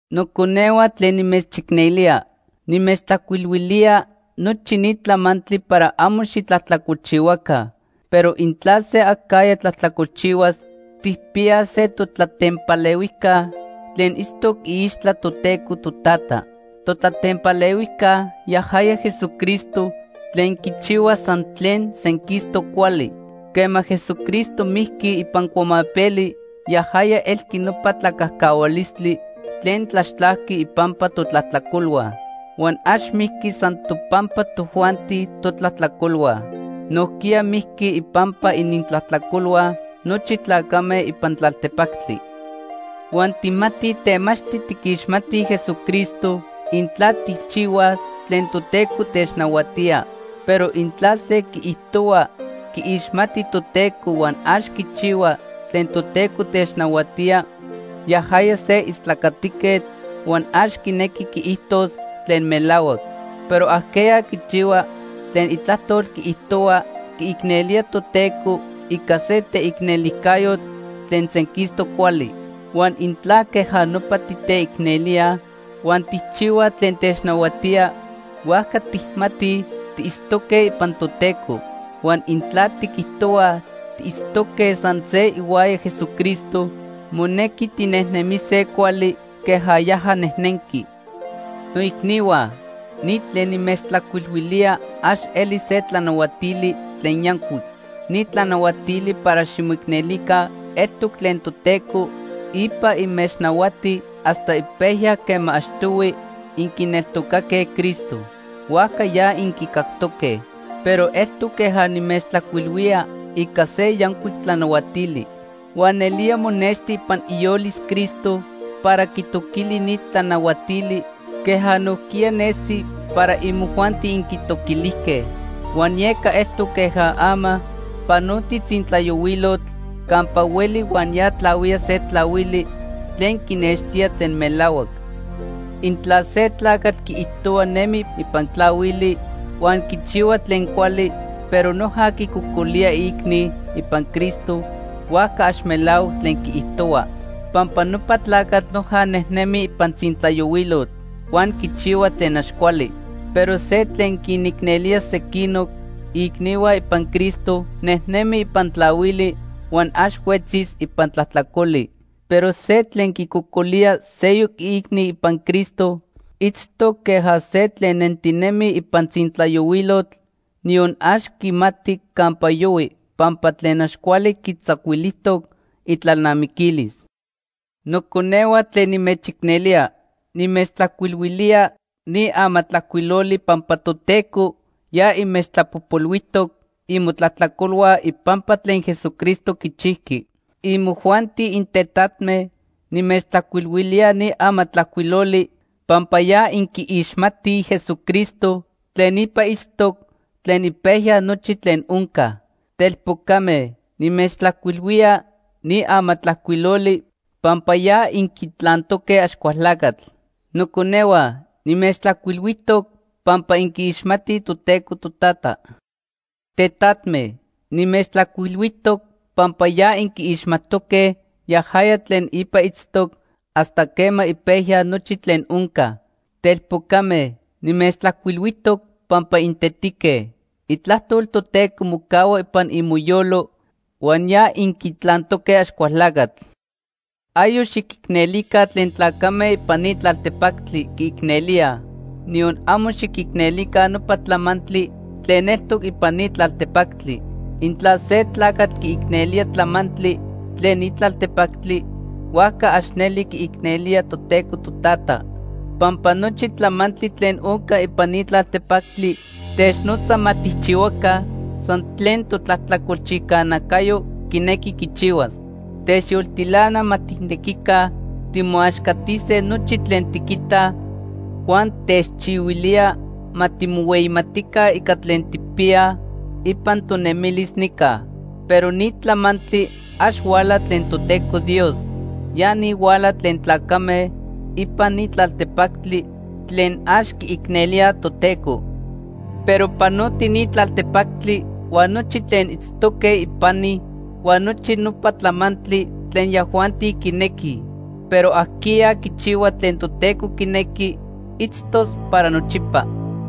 Noconehua tlen nimechicnelía, nimechtlajcuilhuilía nochi ni tlamantli para amo xitlajtlacolchihuaca. Pero intla se acajya tlajtlacolchihuas, tijpiyaj se totlatempalehuijca tlen itztoc iixtla Toteco Totata. Totlatempalehuijca yajaya Jesucristo tlen quichihua san tlen senquistoc cuali. Quema Jesucristo mijqui ipan cuamapeli, yajaya elqui nopa tlacajcahualistli tlen tlaxtlajqui ipampa totlajtlacolhua. Huan ax mijqui san topampa tojuanti totlajtlacolhua. Nojquiya mijqui ipampa inintlajtlacolhua nochi tlacame ipan tlaltepactli. Huan tijmatij temachtli tiquixmatij Jesucristo, intla tijchihuaj tlen Toteco technahuatía. Pero intla se quiijtohua quiixmati Toteco huan ax quichihua tlen Toteco technahuatía, yajaya se istlacatiquetl huan ax quinequi quiijtos tlen melahuac. Pero ajqueya quichihua tlen itlajtol quiijtohua, quiicnelía Toteco ica se teicnelijcayotl tlen senquistoc cuali. Huan intla queja nopa titeicnelíaj huan tijchihuaj tlen technahuatía, huajca tijmatij tiitztoque ipan Toteco. Huan intla tiquijtohuaj tiitztoque san se ihuaya Jesucristo, monequi tinejnemise cuali queja yaja nejnenqui. Noicnihua, ni tlen nimechtlajcuilhuilía ax eli se tlanahuatili tlen yancuic. Ni tlanahuatili para ximoicnelica eltoc tlen Toteco ipa inmechnahuati hasta ipejya quema achtohui inquineltocaque Cristo. Huajca ya inquicactoque. Pero eltoc queja nimechtlajcuilhuía ica se yancuic tlanahuatili. Huan nelía monexti ipan iyolis Cristo para quitoquili ni tlanahuatili queja nojquiya nesi para imojuanti inquitoquilijque. Huan yeca eltoc queja ama panotij tzintlayohuilotl campa hueli huan ya tlahuía se tlahuili tlen quinextía tlen melahuac. Intla se tlacatl quiijtohua nemi ipan tlahuili huan quichihua tlen cuali, pero noja quicocolía iicni ipan Cristo, huajca ax melahuac tlen quiijtohua. Pampa nopa tlacatl noja nejnemi ipan tzintlayohuilotl huan quichihua tlen ax cuali. Pero se tlen quinicnelía sequinoc iicnihua ipan Cristo, nejnemi ipan tlahuili huan ax huetzis ipan tlajtlacoli. Pero se tlen quicocolía seyoc iicni ipan Cristo, itztoc queja se tlen nentinemi ipan tzintlayohuilotl, niyon ax quimati campa yohui pampa tlen ax cuali quitzacuilijtoc itlalnamiquilis. Noconehua tlen nimechicnelía, nimechtlajcuilhuilía ni amatlajcuiloli pampa Toteco ya inmechtlapojpolhuijtoc imotlajtlacolhua ipampa tlen Jesucristo quichijqui. Imojuanti intetatme, nimechtlajcuilhuilía ni amatlajcuiloli pampa ya inquiixmatij Jesucristo tlen ipa itztoc tlen ipejya nochi tlen onca. Telpocame, nimechtlajcuilhuía ni amatlajcuiloli pampa ya inquitlantoque Axcualtlacatl. Noconehua, nimechtlajcuilhuijtoc pampa inquiixmatij Toteco Totata. Tetatme, nimechtlajcuilhuijtoc pampa ya inquiixmajtoque yajaya tlen ipa itztoc hasta quema ipejya nochi tlen onca. Telpocame, nimechtlajcuilhuijtoc pampa intetique. Itlajtol Toteco mocahua ipan imoyolo huan ya inquitlantoque Axcualtlacatl. Ayoc xiquicnelica tlen tlacame ipan ni tlaltepactli quiicnelíaj, niyon amo xiquicnelica nopa tlamantli tlen eltoc ipan ni tlaltepactli. Intla se tlacatl quiicnelía tlamantli tlen ni tlaltepactli, huajca ax neli quiicnelía Toteco Totata. Pampa nochi tlamantli tlen onca ipan ni tlaltepactli technotza ma tijchihuaca san tlen totlajtlacolchijca nacayo quinequi quichihuas. Techyoltilana ma tijnequica timoaxcatise nochi tlen tiquitaj, huan techchihuilía ma timohueyimatica ica tlen tijpiyaj ipan tonemilis nica. Pero ni tlamantli ax huala tlen Toteco Dios, ya ni huala tlen tlacame ipan ni tlaltepactli tlen ax quiicnelíaj Toteco. Pero panoti ni tlaltepactli huan nochi tlen itztoque ipani, huan nochi nopa tlamantli tlen yajuanti quinequij. Pero ajqueya quichihua tlen Toteco quinequi, itztos para nochipa.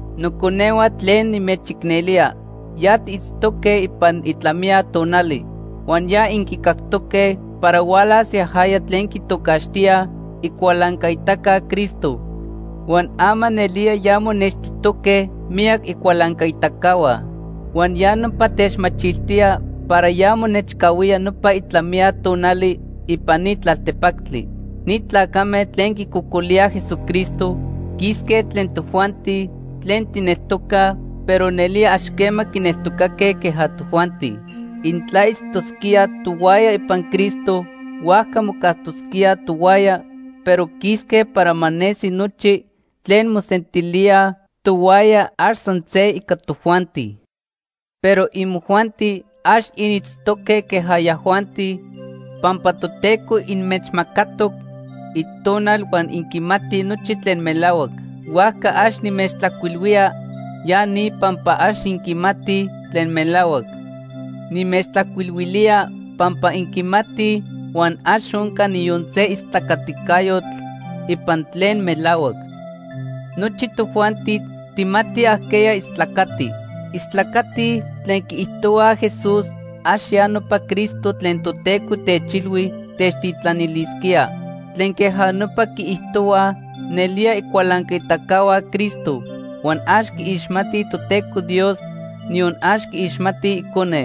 Noconehua tlen nimechicnelía, ya tiitztoque ipan itlamiya tonali. Huan ya inquicactoque para hualas yajaya tlen quitocaxtíaj Icualancaitaca Cristo, huan ama nelía ya monextijtoque miyac icualancaitacahua. Huan ya nopa techmachiltía para ya monechcahuía nopa itlamiya tonali ipan ni tlaltepactli. Ni tlacame tlen quicocolíaj Jesucristo quisque tlen tojuanti tlen tijneltocaj, pero nelía ax quema quineltocaque queja tojuanti. Intla itztosquíaj tohuaya ipan Cristo, huajca mocajtosquíaj tohuaya, pero quisque para ma nesi nochi tlen mosentilíaj tohuaya ax san se ica tojuanti. Pero imojuanti, ax initztoque queja yajuanti, pampa Toteco inmechmacatoc Itonal huan inquimatij nochi tlen melahuac. Huajca ax nimechtlajcuilhuía ya ni pampa ax inquimatij tlen melahuac. Nimechtlajcuilhuilía pampa inquimatij, huan ax onca niyon se istlacaticayotl ipan tlen melahuac. Nochi tojuanti tijmatij ajqueya istlacati. Istlacatij tlen quiijtohuaj Jesús ax ya nopa Cristo tlen Toteco techilhui techtitlanilisquía. Tlen queja nopa quiijtohuaj nelía icualancaitacahua Cristo huan ax quiixmatij Toteco Dios, niyon ax quiixmatij Icone.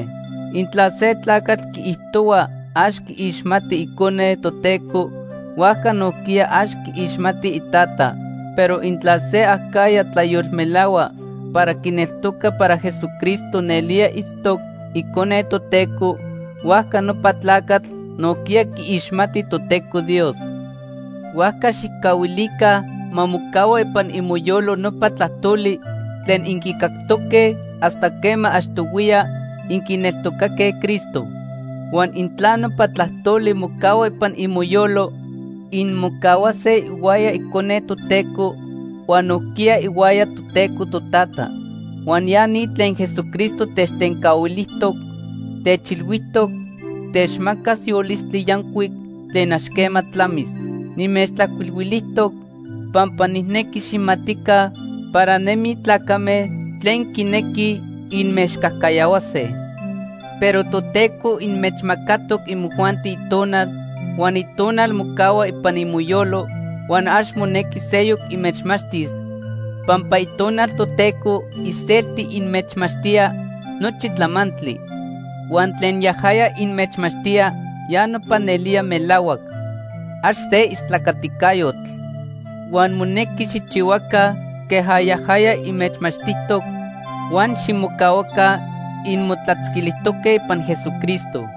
Intla se tlacatl quiijtohua ax quiixmati Icone Toteco, huajca nojquiya ax quiixmati iTata. Pero intla se acajya tlayolmelahua para quineltoca para Jesucristo nelía itztoc Icone Toteco, huajca nopa tlacatl nojquiya quiixmati Toteco Dios. Huajca xijcahuilica ma mocahua ipan imoyolo nopa tlajtoli tlen inquicactoque hasta quema achtohuiya inquineltocaque Cristo. Huan intla nopa tlajtoli mocahua ipan imoyolo, inmocahuase ihuaya Icone Toteco huan nojquiya ihuaya Toteco Totata. Huan ya ni tlen Jesucristo techtencahuilijtoc; techilhuijtoc techmacas yolistli yancuic tlen ax quema tlamis. Nimechtlajcuilhuijtoc pampa nijnequi xijmatica para nemij tlacame tlen quinequij inmechcajcayahuase. Pero Toteco inmechmacatoc imojuanti Itonal, huan Itonal mocahua ipan imoyolo huan ax monequi seyoc inmechmachtis pampa Itonal Toteco iselti inmechmachtía nochi tlamantli. Huan tlen yajaya inmechmachtía ya nopa nelía melahuac. Ax se istlacaticayotl. Huan monequi xijchihuaca queja yajaya inmechmachtijtoc, huan ximocahuaca inmotlatzquilijtoque ipan Jesucristo.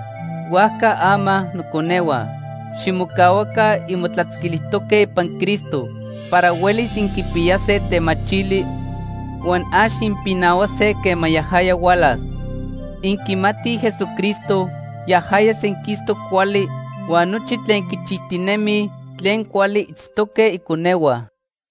Huajca ama noconehua, ximocahuaca inmotlatzquilijtoque ipan Cristo para huelis inquipiyase temachili huan ax inpinahuase quema yajaya hualas. Inquimatij Jesucristo yajaya senquistoc cuali, huan nochi tlen quichijtinemij tlen cuali itztoque iconehua.